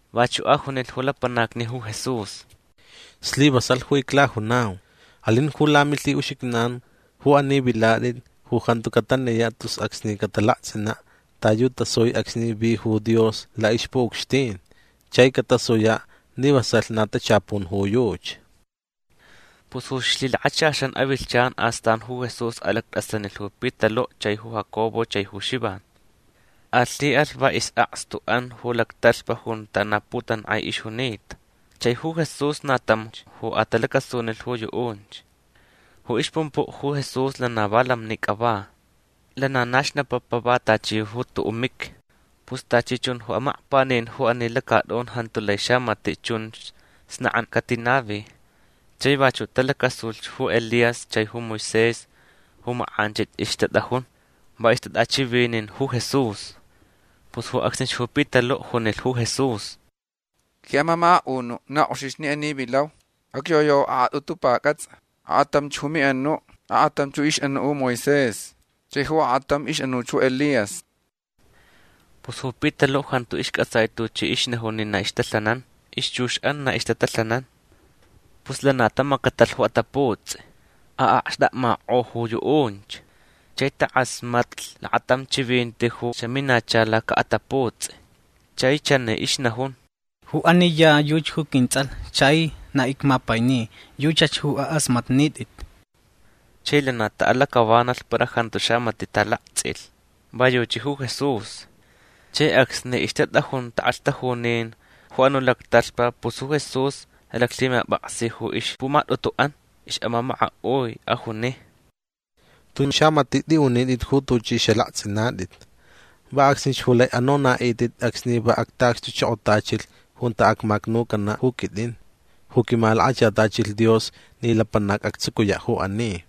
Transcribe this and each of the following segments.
Vachuʼ ajunilh ju lapanacni ju Jesús: ―Slivasalh ju iclajunau. Alin ju lamilhiʼuxijnan ju ani vilatʼit ju jantu cataniyaʼ tus acsni catalaktsʼinaʼ ta yu tasui acsni vi ju Dios laʼixpuʼucxtin. Chai catasuyaʼ ni vasalh na tachapun ju yuchi. Pus ju ixlhilakachaxan avilhchan astan ju Jesús alactʼasanilh ju Pitaluʼ chai ju Jacobo chai ju Xivan. Alhiʼalh va isʼakstuʼan ju lactalhpa junta na putankʼai ixjunita. Chai ju Jesús na tamch ju atalacasunilh ju yuʼunch. Ju ixpumpuʼ ju Jesús lana va lamnicʼa va. Lana na xnapapa va tachi ju tuʼuʼ miqui. Pus tachi chun ju amakpanin ju ani lacatʼun jantu lai xamatiʼ chunch snakʼankʼa catinavi. Chai vachuʼ talacasuch ju Elías chai ju Moisés ju makʼanchich ixtatʼajun. Va ixtatʼachivinin ju Jesús. Pus ju acsnich ju Pitaluʼ junilh ju Jesús: ―Quiʼamamakaʼunuʼ na kʼoxich ni ani vilau. Acyoyau akʼatʼutu pacʼatsʼa. Akʼatamch ju miʼanuʼ. Akʼatam ixʼanuʼ ju Moisés. Chai ju akʼatamch ixʼanuʼ ju Elías. Pus ju Pitaluʼ jantu iscʼatsai tuchi ixnajun ni na ixtalhanan. Ixchuxʼan na ixtatalhanan. Pus lana tamacatalh ju ataputsʼi. Aʼakxtakmakʼo ju yuʼunch. Chai takʼasmatlh lakatam chivinti ju xaminacha lacaʼataputsʼi. Chai chani ixnajun: ―Ju ani ya yuchi ju quintsʼalh chai na icmapaini. Yuchach ju akʼasmatnitʼit. Chai lana taʼalacʼavanalh para jantu xamatiʼ talaktsʼilh. Va yuchi ju Jesús. Chai acsni ixtatʼajun takʼalhtajunin ju anuʼ lactalhpa pus ju Jesús alaclhimapʼaksi ju ixpumatʼutuʼan ixʼamamakaʼui. Ajuni: ―Tun xamatiʼ tʼiʼunitʼit ju tuchʼi xalaktsʼinatʼit. Va acsnich ju lai anonaʼitʼit acsni va actaʼacxtuchokotachilh junta acmacnucanaʼ ju quitʼin ju quimalakachatachilh Dios ni lapanac actsucuyaʼ ju ani.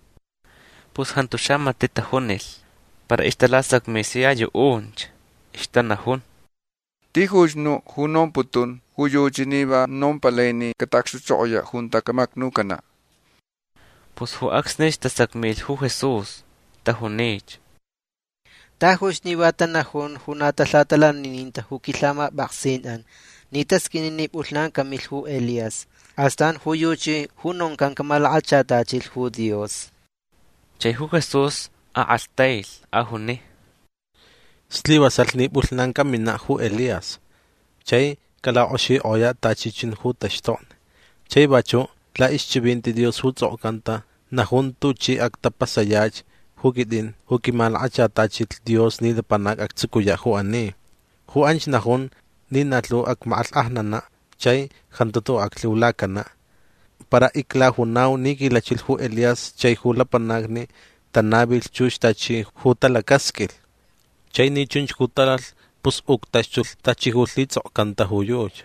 Pus jantu xamatiʼ tajunilh. Para ixtalasacmi sia yuʼunch. Ixtanajun: ―Tijuch nuʼ ju nomputun ju yuchi ni va nompalai ni cataʼacxtuchokoyaʼ junta camacnucanaʼ. Pus ju acsnich tasacmilh ju Jesús. Tajunich: ―Tajuch ni va tanajun ju na talhatalanininta ju quilhamapʼaksinʼan ni tasqʼuini ni pʼulhnan camilh ju Elías. Astan ju yuchi ju noncan camalakachatachilh ju Dios. Chai ju Jesús akʼalhtailh. Ajuni: ―Slivasalh ni pʼulhnan caminaʼ ju Elías. Chai calakʼoxikʼoyaʼ tachi chun ju taxtokni. Chai vachuʼ laʼixchivinti Dios ju tsʼokcanta najun tuchi actapasayach ju quitʼin ju quimalakachatachilh Dios ni lapanac actsucuyaʼ ju ani. Ju anch najun ni na lhu acmakʼalhkʼajnanaʼ chai jantu tuʼuʼ aclhiulacanaʼ. Para iclajunau ni quilachilh ju Elías chai ju lapanacni tanavilh chux tachi ju talacasqʼuilh. Chai ni chunch ju talalh pus uctaxtulh tachi ju lhitsʼokcanta ju yuchi.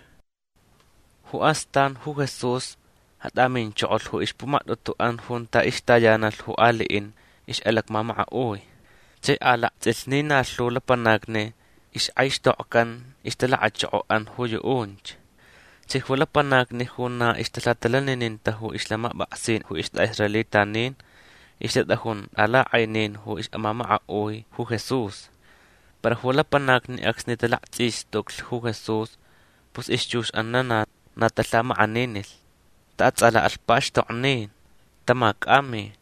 Ju astan ju Jesús atʼaminchokolh ju ixpumatʼutuʼan junta ixtayanalh ju aliʼin ixʼalacmamakaʼui. Chai alaktsʼilh ni na lhu lapanacni ixkʼaixtokcan ixtalakachokoʼan ju yuʼunch. Chai ju lapanacni ju na ixtalhatalanininta ju ixlhamapʼaksin ju istʼaʼisraelitanin ixtatʼajun tʼalakʼainin ju ixʼamamakaʼui ju Jesús. Para ju lapanacni acsni talaktsʼistuclh ju Jesús pus ixchuxʼan lana na talhamakʼaninilh. Taʼatsʼalaʼalh pakxtoknin. Tamacʼami.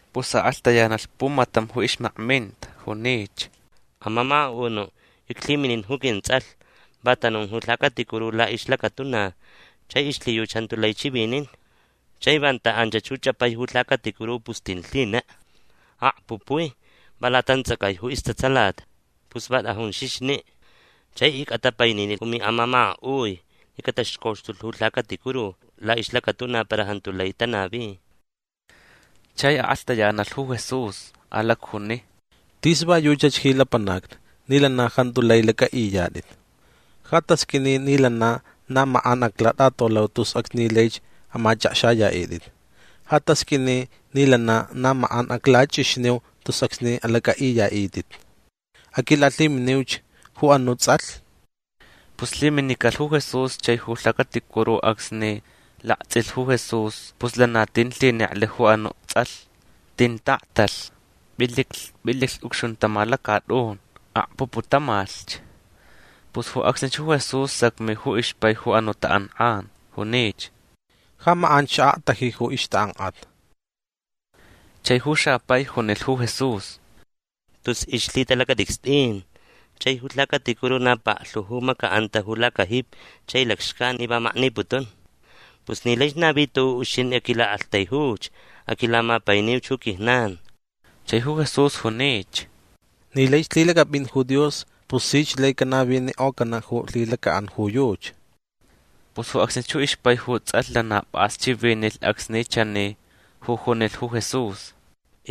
Pus akʼalhtayanalh pumatam ju ixmakminta. Junich: ―Amamakaʼunuʼ. Iclhiminin ju quintsʼalh. Va tanun ju lhacaticuru laʼixlacatuna chai ixlhiyuchi jantu lai chivinin. Chai vanta anchach ju chʼapai ju lhacaticuru pus tin lhinek. Akpupuich. Va latantsʼacai ju istatsalat. Pus va tʼajun xixniʼ. Chai icʼatapaininilh ju miʼamamakaʼui ni cataxcoxtulh ju lhacaticuru laʼixlacatuna para jantu lai tanavi. Chai akʼalhtayanalh ju Jesús. Alacjuni: ―Tis va yuchach ji lapanacni ni lana jantu lai lacʼaʼiyatʼit. Ja tasqʼuini ni lana na makʼan aclatʼatolau tus acsni laich amachʼakxayaʼitʼit. Ja tasqʼuini ni lana na makʼan aclachʼixniu tus acsni alacʼaʼiyaʼitʼit. Aquilalhiminiuch ju anuʼ tsʼalh. Pus lhiminicalh ju Jesús chai ju lhacaticuru acsni laktsʼilh ju Jesús pus lana tin lhineklh ju anuʼ tsʼalh. Tin taʼaktalh. Pʼiliclh pʼiliclh ucxuntama lacatʼun. Akpuputamalhch. Pus ju acsnich ju Jesús sacmi ju ixpai ju anuʼ takʼankʼan. Junich: ―Ja makʼanch xaʼaktaji ju ixtakʼankʼat. Chai ju xapai junilh ju Jesús: ―Tus ixlhitalacatʼicstʼin. Chai ju lhacaticuru na paklhu ju macaʼanta ju lacajipi chai lacxcan ni va makniputun. Pus ni laich navi tuʼuʼ ju uxintʼi aquilaʼaktaijuch. Aquilamapainiuch ju quijnan. Chai ju Jesús junich: ―Ni laich lhilacʼapʼin ju Dios pus sich lai canavinikʼocanaʼ ju lhilacaʼan yuchi. Pus ju acsnich ju ixpai ju tsʼalh lana pʼas chivinilh acsni chani ju junilh ju Jesús: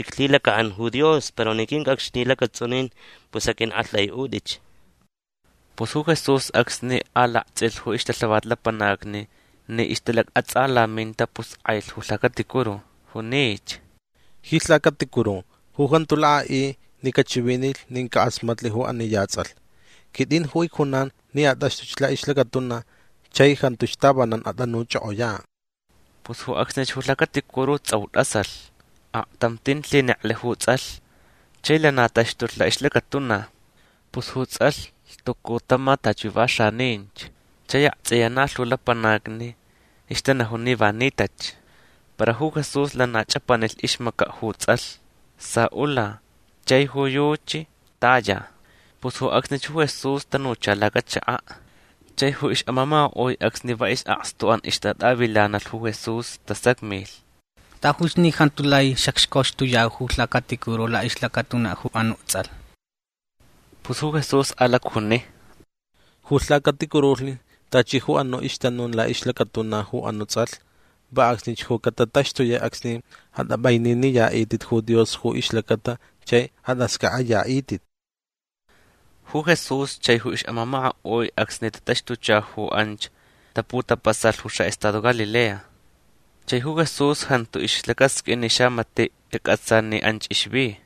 ―Iclhilacaʼan ju Dios. Para ni quincʼacxni lacatsʼunin pus aqʼuiʼaktʼaiʼutʼich. Pus ju Jesús acsni alaktsʼilh ju ixtalhavat lapanacni ni ixtalacʼatsʼalaminta pus kʼailh ju lhacaticuru. Junich: ―Ji lhacaticuru ju jantu lakʼaʼi ni cachivinilh nin cakʼasmatlh ju ani ya tsʼalh quitʼin ju icjunan ni atʼaxtʼuch laʼixlacatuna chai jantuch tavanan atʼanuchʼokʼoyaʼ. Pus ju acsnich ju lhacaticuru tsʼau tʼasalh. Aktam tin lhineklh ju tsʼalh. Chai lana taxtulh laʼixlacatuna. Pus ju tsʼalh lhtucu tama tachi ju va xaninch. Chai aktsʼiya na lhu lapanacni ixtanajun ni va nitach. Para ju Jesús lana chʼapanilh ixmacaʼ ju tsʼalh. Saʼula. Chai ju yuchi taya. Pus ju acsnich ju Jesús tanucha lacachakaʼ. Chai ju ixʼamamakaʼui acsni va isʼakstuʼan ixtatʼavilanalh ju Jesús tasacmilh: ―Tajuch ni jantu lai xacxcoxtuyau ju lhacaticuru laʼixlacatuna ju anuʼ tsʼalh. Pus ju Jesús alacjuni: ―Ju lhacaticurulhni tachi ju anuʼ ixtanun laʼixlacatuna ju anuʼ tsʼalh va acsnich ju catataxtuyaʼ acsni atʼapʼaininiyaʼitʼit ju Dios ju ixlacata chai atʼascʼaʼayaʼitʼit. Ju Jesús chai ju ixʼamamakaʼui acsni tataxtucha ju anch taputapasalh ju xaʼestado Galilea. Chai ju Jesús jantu ixlacasqʼuin ni xamatiʼ cacʼatsa ni anch ixvi.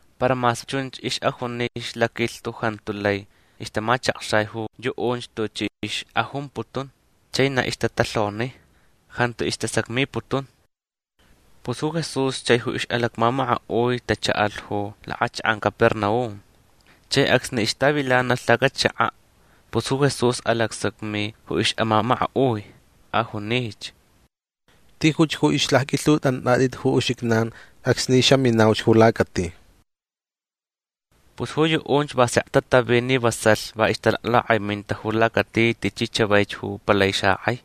Para mas chunch ixʼajuni ixlaquilhtu jantu lai ixtamachakxai ju yuʼunch tuchi ixʼajumputun. Chai na ixtatalhoni. Jantu istasacmiputun. Pus ju Jesús chai ju ixʼalacmamakaʼui tachaʼalh ju lakʼachakʼan Capernaum. Chai acsni ixtavilanalh lacachakaʼ pus ju Jesús alacsacmi ju ixʼamamakaʼui. Ajunich: ―Tijuch ju ixlacqʼuilhuntʼonatʼit ju uxijnan acsni xaminauch ju lacati. Pus ju yuʼunch va sek tatavi ni vasalh va ixtalaklakʼaiminta ju lacati tichi chavaich ju palai xakʼai.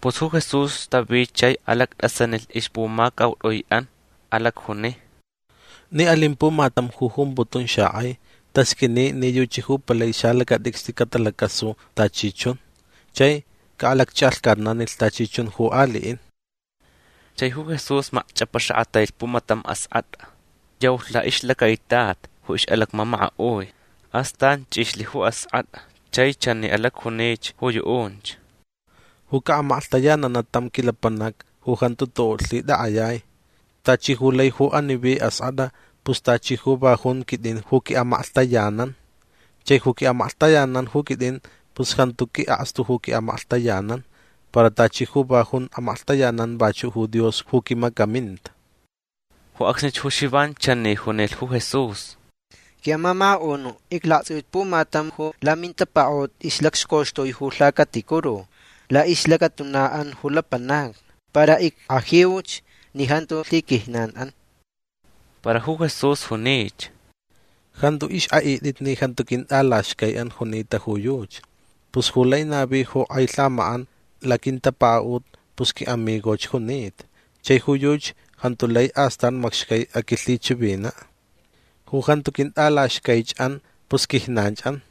Pus ju Jesús tavi chai alactʼasanilh ixpumacautʼuiʼan. Alacjuni: ―Ni alin pumatam ju jumputun xakʼai tasqʼuini ni yuchi ju palai salacatʼicstʼi catalacasu tachi chun. Chai caʼalacchʼalhcatnanilh tachi chun ju aliʼin. Chai ju Jesús macchʼapaxakʼatailh pumatam askʼatʼa. Yaulh laʼixlacaitat ju ixlacmamakaʼui. Astan chʼixlh ju askʼatʼa chai chani alacjunich ju yuʼunch: ―Ju caʼamaklhtayananaʼ tam quilapanac ju jantu tuʼuʼ lhitʼakʼayai tachi ju lai ju ani vi askʼatʼa pus tachi ju va jun quitʼin ju quiʼamaklhtayanan. Chai ju quiʼamaklhtayanan ju quitʼin pus jantu quiʼakstu ju quiʼamaklhtayanan. Para tachi ju va jun amaklhtayanan vachuʼ ju Dios ju quimacaminta. Ju acsnich ju Xivan chani junilh ju Jesús: ―Quiʼamamakaʼunuʼ iclaktsʼiuch pumatam ju lamintapakaʼut ixʼalacxcoxtui ju lhacaticuru laʼixlacatunaʼan ju lapanacni. Para ickʼajiuch ni jantu lhiquijnanʼan. Para ju Jesús junich: ―Jantu ixkʼaʼitʼit ni jantu quintʼalaxcaiʼan junita ju yuchi. Pus ju lai navi ju kʼai lhamakʼan laquintapakaʼut pus quiʼamigoch junita. Chai ju yuchi jantu lai astan macxcai aquilhichivinaʼ. Ju jantu quintʼalaxcaichʼan pus quijnanchʼan.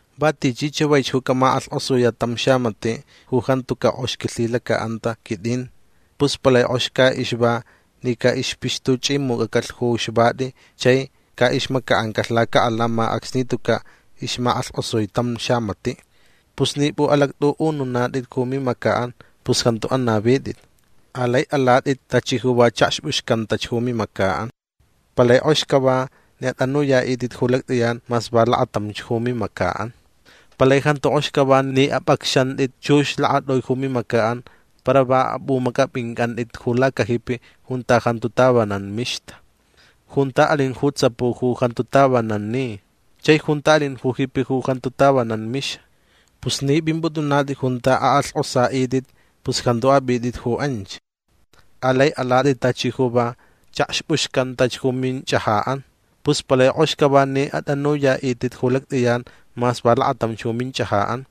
―Va tichi chavaich ju camakʼalhkʼosuyaʼ tam xamatiʼ ju jantucaʼ kʼox quilhilacaʼanta quitʼin pus palai kʼox caʼixva ni caʼixpixtuchʼimucʼacalh ju xvati chai caʼixmacaʼancalh lacaʼalama acsni tucaʼ ixmakʼalhkʼosui tam xamatiʼ. Pus ni pʼuʼalactʼuʼununatʼit ju mimacaʼan pus jantu anavitʼit. Alai alatʼit tachi ju va chʼakxpʼuxcantach ju mimacaʼan. Palai kʼox cava ni atʼanuyaʼitʼit ju lactʼiyan mas va lakatamch ju mimacaʼan. Palai jantu kʼox cava ni apʼacxantʼit chux lakatʼui ju mimacaʼan para va apʼumacʼapʼincʼantʼit ju lacajipi junta jantu tavanan mixta. Junta alin ju tsapu ju jantu tavanan ni chai junta alin ju jipi ju jantu tavanan mixa. Pus ni pʼimpʼutʼunatʼit junta akʼalhkʼosaʼitʼit pus jantu apʼitʼit ju anch. Alai alatʼit tachi ju va chʼakxpʼuxcantach ju minchʼajaʼan. Pus palai kʼox cava ni atʼanuyaʼitʼit ju lactʼiyan mas va lakatamch ju minchʼajaʼan.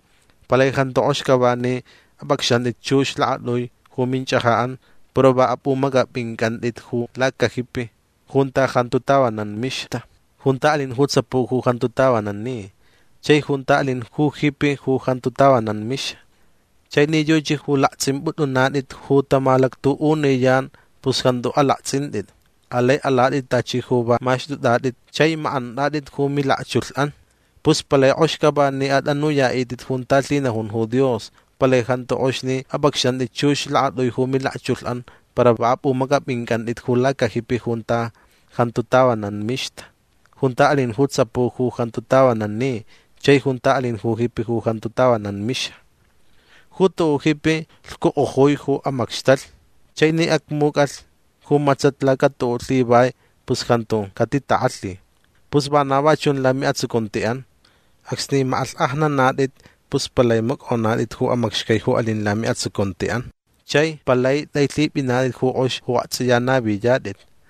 Palai jantu kʼox cava ni apʼacxantʼit chux lakatʼui ju minchʼajaʼan para va apʼumacʼapʼincʼantʼit ju lacajipi junta jantu tavanan mixta. Junta alin ju tsapu ju jantu tavanan ni. Chai junta alin ju jipi ju jantu tavanan mixa. Chai ni yuchi ju laktsʼimpʼutʼunatʼit ju tamalactuʼuniyan pus jantu alaktsʼintʼit. Alai alatʼit tachi ju va maxtʼutʼatʼit chai makʼantʼatʼit ju milakchulhʼan. Pus palai kʼox cava ni atʼanuyaʼitʼit junta lhinajun ju Dios. Palai jantu kʼox ni apʼacxantʼit chux lakatʼui ju milakchulhʼan para va apʼumacʼapʼincʼantʼit ju lacajipi junta jantu tavanan mixta. Junta alin ju tsapu ju jantu tavanan ni. Chai junta alin ju jipi ju jantu tavanan mixa. Ju tuʼuʼ jipi lhcukʼojui ju amacxtalh. Chai ni acmucʼalh ju matsat lacatuʼuʼ lhivai pus jantu catitakʼalhi. Pus vana va chun lamiʼatsucuntiʼan. Acsni makʼalhkʼajnanatʼit pus palai macʼonatʼit ju amacxcai ju alin lamiʼatsucuntiʼan chai palai tʼailhipʼinatʼit ju kʼox ju aktsʼiya naviyatʼit.